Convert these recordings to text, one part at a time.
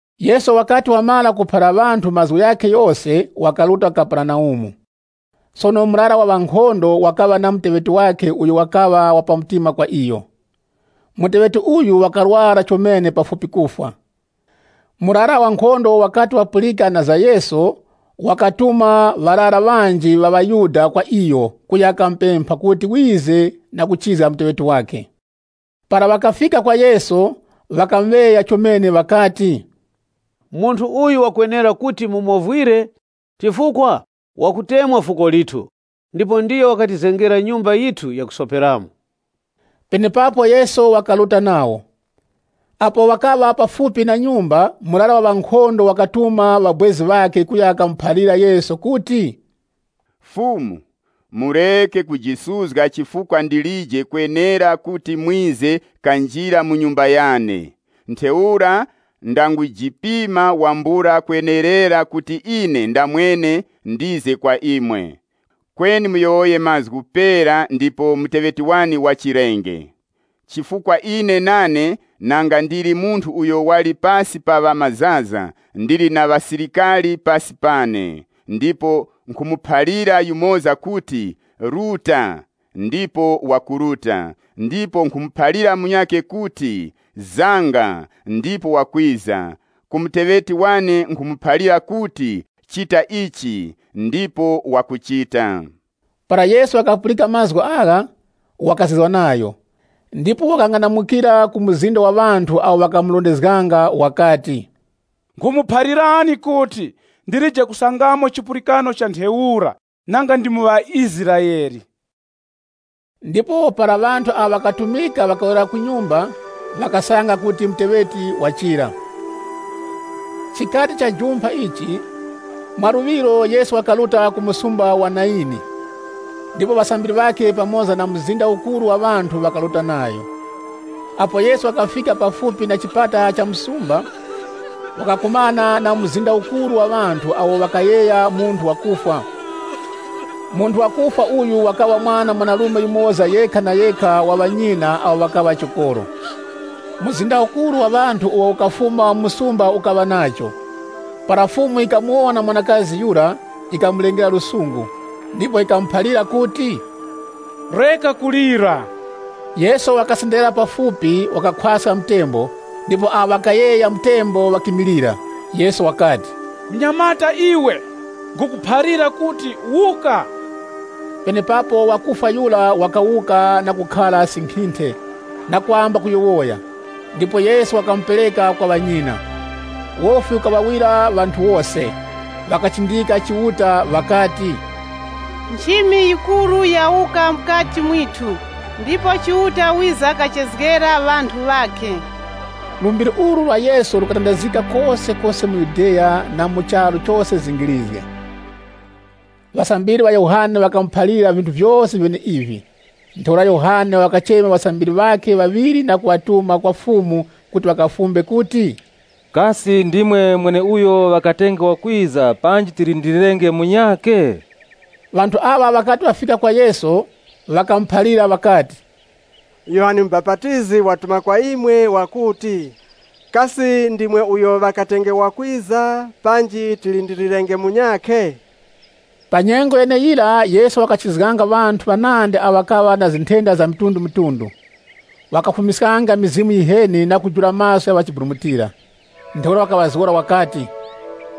Yesu wakati wamara kuphalira ŵanthu mazgu ghakhe ghose wakaruta ku Kaperenaumu. Sono murara wa ŵankhondo wakaŵa na muteŵeti wakhe uyo wakaŵa wa pa mtima kwa iyo. Muteŵeti uyu wakarwara chomene pafupi kufwa. Murara wa nkhondo wakati wapulika na za Yesu, wakatuma ŵarara ŵanji ŵa ŵaYuda kwa iyo kuya kamupempha kuti wize na kuchizga muteŵeti wakhe. Para ŵakafika kwa Yesu, ŵakamuŵeya chomene ŵakati, “Munthu uyu wakwenera kuti mumovwire, chifukwa wakutemwa fuko lithu, ndipo ndiyo wakatizengera nyumba yithu yakusoperamo.” Penepapo Yesu wakaruta nawo. Apo ŵakaŵa kufupi na nyumba, murara wa ŵankhondo wakatuma ŵabwezi ŵakhe kuya kamuphalira Yesu kuti, “Fumu, mureke kujisuzga chifukwa ndilije kwenera kuti mwize kanjire mu nyumba yane. Ntheura ndangujipima wambula kwenerera kuti ine ndamwene ndize kwa imwe. Kweni muyowoye mazgu pera ndipo muteŵeti wane wachirenge. Chifukwa ine nane nanga ndili munthu uyo wali pasi pa ŵamazaza, ndili na ŵasilikari pasi pane, ndipo nkhumuphalira yumoza kuti, ‘Ruta,’ ndipo wakuruta, ndipo nkhumuphalira munyakhe kuti, ‘Zanga,’ ndipo wakwiza. Ku muteŵeti wane nkhumuphalira kuti, ‘Chita ichi,’ ndipo wakuchita.” Para Yesu wakapulika mazgu agha, wakazizwa nayo, ndipo wakang'anamukira ku mzinda wa ŵanthu awo ŵakamurondezganga wakati, “Nkhumuphalirani kuti, ndilije kusangamo chipulikano cha ntheura nanga ndi mu ŵaIsraele.” Ndipo para ŵanthu awo ŵakatumika, ŵakawerera ku nyumba, wakasanga kuti muteŵeti wachira. Chikati chajumpha ichi, mwaluŵiro Yesu wakaruta ku msumba wa Nayini. Ndipo ŵasambiri ŵakhe pamoza na mzinda ukuru wa ŵanthu, ŵakaruta nayo. Apo Yesu wakafika pafupi na chipata cha msumba, wakakumana na mzinda ukuru wa ŵanthu awo ŵakayegha munthu wakufwa. Munthu wakufwa uyu wakaŵa mwana mwanarume yumoza yekha na yekha wa ŵanyina awo ŵakaŵa chokoro. Mzinda ukuru wa ŵanthu uwo ukafuma mu msumba ukaŵa nacho. Para Fumu yikamuwona mwanakazi yura, yikaŵa nayo na chiwuravi, ndipo yikamuphalira kuti, “Reka kulira.” Yesu wakasenderera pafupi, wakakhwaska mtembo, ndipo awo ŵakayegha mtembo ŵakimilira. Yesu wakati, “Wa munyamata iwe, nkhukuphalira kuti, ‘wuka!’” Penepapo wakufwa yura wakawuka na kukhara sinkhinthe na kwamba kuyowoya. Ndipo Yesu wakamupereka kwa ŵanyina. Wofi ukaŵawira ŵanthu wose, ŵakachindika Chiuta ŵakati, “Nchimi yikuru yawuka mukati mwithu! Ndipo Chiuta wiza kachezgera ŵanthu ŵakhe.” Lumbiri ulu lwa Yesu lukatandazgika kosekose mu Yudeya, na mu charu chose zingirizge. Ŵasambiri ŵa Yohane ŵakamuphalira vinthu vyose vyeneivi. Ntheura Yohane wakachema ŵasambiri ŵakhe ŵaŵiri na kuŵatuma kwa Fumu kuti ŵakafumbe kuti, “Kasi ndimwe mweneuyo ŵakatenge wakwiza panji tilindilirenge munyakhe?” Ŵanthu aŵa ŵakati ŵafika kwa Yesu, ŵakamuphalira ŵakati, “Yohane Mubapatizi watituma kwa imwe, wakuti, ‘Kasi ndimwe uyo ŵakatenge wakwiza panji tilindilirenge munyakhe?’” Pa nyengo yeneyira, Yesu wakachizganga ŵanthu ŵanandi awo ŵakaŵa na nthenda za mitundumitundu. Wakafumiskanga mizimu yiheni, na kujula maso gha ŵa chiburumutira. Ntheura wakaŵazgora wakati,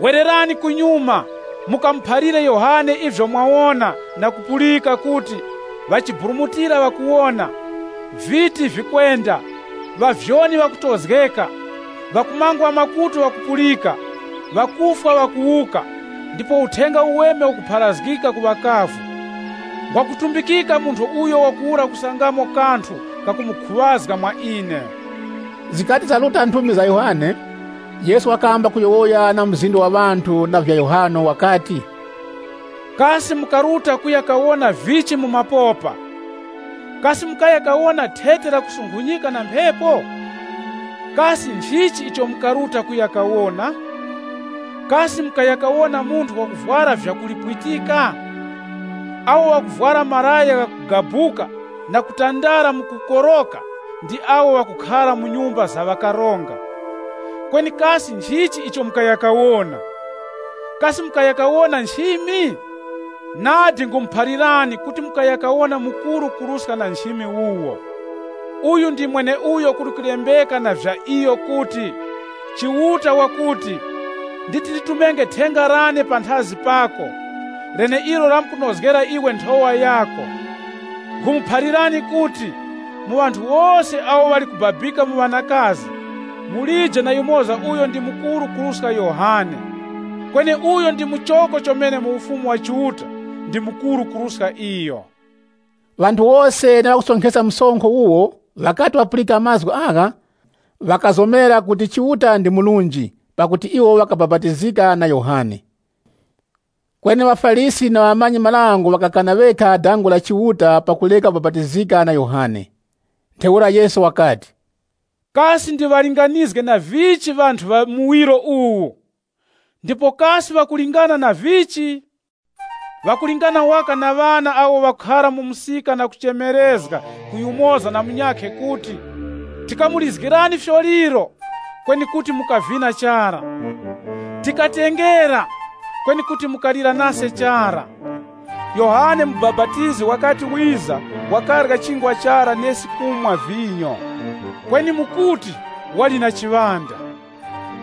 “Wererani kunyuma mukamuphalire Yohane ivyo mwawona na kupulika kuti, ŵachiburumutira ŵakuwona, viti vikwenda, ŵavyoni ŵakutozgeka, ŵakumangwa makutu ŵakupulika, ŵakufwa ŵakuwuka, ndipo Uthenga Uweme ukupharazgika ku ŵakavu. Ngwakutumbikika munthu uyo wakuwura kusangamo kanthu kakumukhuŵazga mwa ine.” Zikati zaruta nthumi za Yohane, Yesu wakamba kuyowoya na mzinda wa ŵanthu na vya Yohane wakati, “Kasi mukaruta kuya kawona vichi mu mapopa? Kasi mukaya kawona thete lakusunkhunyika na mphepo? Kasi nchichi icho mukaruta kuya kawona? Kasi mukaya kawona munthu wakuvwara vyakulipwitika? Awo ŵakuvwara malaya ghakugabuka na kutandara mu kukoroka, ndi awo ŵakukhara mu nyumba za ufumu. Kweni kasi nchichi icho mukaya kawona? Kasi mukaya kawona nchimi? Nadi nkhumuphalirani kuti mukaya kawona mukuru kuruska na nchimi wuwo. Uyu ndi mweneuyo kuli kulembeka na vya iyo kuti, ‘Chiuta wakuti, “Wonani, nditi nditumenge thenga lane panthazi pako, leneilo lamkunozgera iwe nthowa yako.” ’ Nkhumuphalirani kuti, ‘Mu ŵanthu wose awo ŵali kubabika mu ŵanakazi, mulije na yumoza uyo ndi mukuru kuruska Yohane. Kweni uyo ndi muchoko chomene mu Ufumu wa Chiuta ndi mukuru kuruska iyo.’” Ŵanthu wose na ŵakusonkheska msonkho wuwo, ŵakati ŵapulika mazgu agha, ŵakazomera kuti Chiuta ndi murunji pakuti iwo ŵakabapatizika na Yohane. Kweni ŵaFarisi na ŵamanyi-marango ŵakakana ŵekha dazgo la Chiuta pakureka kubapatizika na Yohane. Ntheura Yesu wakati, “Kasi ndiŵalinganizge na vichi ŵanthu ŵa muwiro uwu? Ndipo kasi ŵakulingana na vichi? Ŵakulingana waka na ŵana awo ŵakhara mu msika na kuchemerezga ku yumoza na munyakhe kuti, ‘Tikamulizgirani fyoliro, kweni kuti mukavina chara. Tikatengera, kweni kuti mukalira nase chara.’ Yohane Mubapatizi wakati wiza, wakarya chingwa chara nesi nkhumwa vinyo. Kweni imwe mukuti, ‘Wali na chiŵanda.’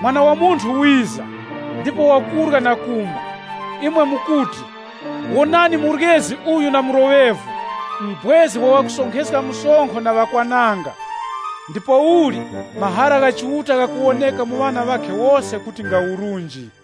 Mwana wa Munthu wiza, ndipo wakurya na kumwa, imwe mukuti, ‘Wonani, muryezi uyu na mloŵevu, mubwezi wa ŵakusonkheska msonkho na ŵakwananga.’ Ndipouli, mahara ghakuwoneka mu ŵana ŵakhe wose kuti nga urunji.”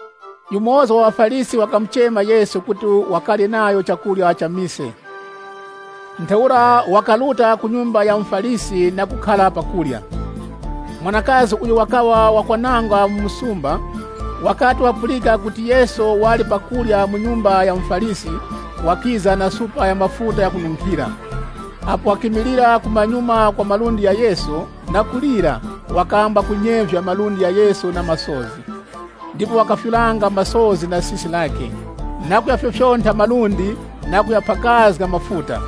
Yumoza wa ŵaFarisi wakamuchema Yesu kuti wakarye nayo chakurya cha mise. Ntheura wakaruta ku nyumba ya muFarisi na kukhara pa kurya. Mwanakazi uyo wakaŵa wakwananga mu msumba, wakati wapulika kuti Yesu wakhara pa kurya mu nyumba ya muFarisi, wakiza na supa ya mafuta ghakununkhira. Apo wakimilira kumanyuma kwa malundi gha Yesu, na kulira, wakamba kunyevya malundi gha Yesu na masozi. Ndipo wakafyuranga masozi na sisi lakhe, na kughafyofyontha malundi, na kughaphakazga mafuta.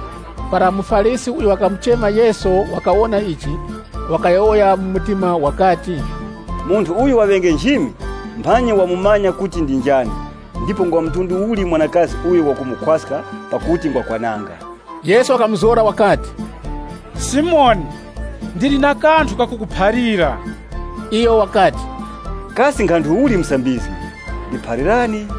Para muFarisi uyo wakamuchema Yesu wakawona ichi, wakayowoya mu mtima wakati, “Munthu uyu waŵenge nchimi, mphanyi wamumanya kuti ndi njani ndipo ngwa mtundu uli mwanakazi uyo wakumukhwaska pakuti ngwakwananga.” Yesu wakamuzgora wakati, “Simoni, ndili na kanthu kakukuphalira.” Iyo wakati, “Kasi nkhanthu uli Musambizgi? Ndiphalirani.”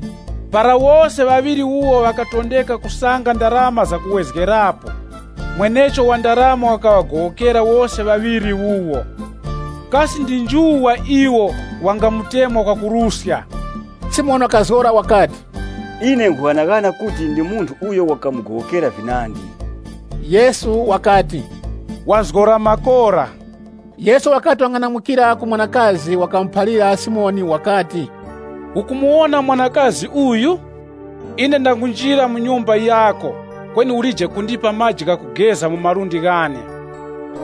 Para wose ŵaŵiri wuwo ŵakatondeka kusanga ndarama za kuwezgerapo, mwenecho wa ndarama wakaŵagowokera wose ŵaŵiri wuwo. Kasi ndi nju wa iwo wangamutemwa kwakuruska?” Simoni wakazgora wakati, “Ine nkhughanaghana kuti ndi munthu uyo wakamugowokera vinandi.” Yesu wakati, “Wazgora makora.” Yesu wakati wang'anamukira ku mwanakazi, wakamuphalira Simoni wakati, “Ukumuwona mwanakazi uyu? Ine ndangunjira muno mu nyumba yako, kweni ulije kundipa maji ghakugeza mu malundi ghane.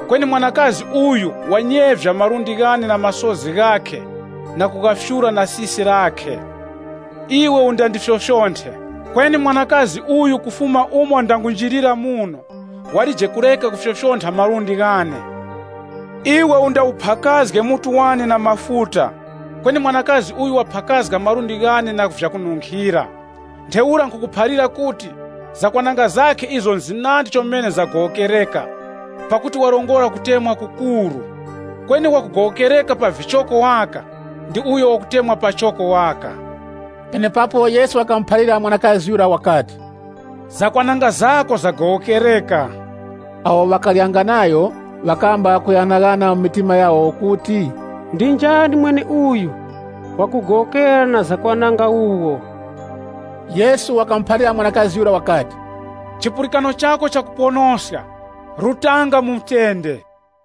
Kweni mwanakazi uyu wanyevya malundi ghane na masozi ghakhe na kughafyura na sisi lakhe. Iwe undandifyofyonthe, kweni mwanakazi uyu kufuma umo ndangunjirira muno, walije kureka kufyofyontha malundi ghane. Iwe undawuphakazge mutu wane na mafuta, kweni mwanakazi uyu waphakazga malundi ghane na vyakununkhira. Ntheura nkhukuphalira kuti, zakwananga zakhe izo nzinandi chomene zagowokereka, pakuti warongora kutemwa kukuru. Kweni wakugowokereka pa vichoko waka, ndi uyo wakutemwa pachoko waka.” Penepapo Yesu wakamuphalira mwanakazi yura wakati, “Zakwananga zako zagowokereka.” Awo ŵakaryanga nayo ŵakamba kughanaghana mu mitima yawo kuti, “Ndi njani mweneuyu wakugowokera na zakwananga wuwo?” Yesu wakamuphalira mwanakazi yura wakati, “Chipulikano chako chakuponoska. Rutanga mu mutende.”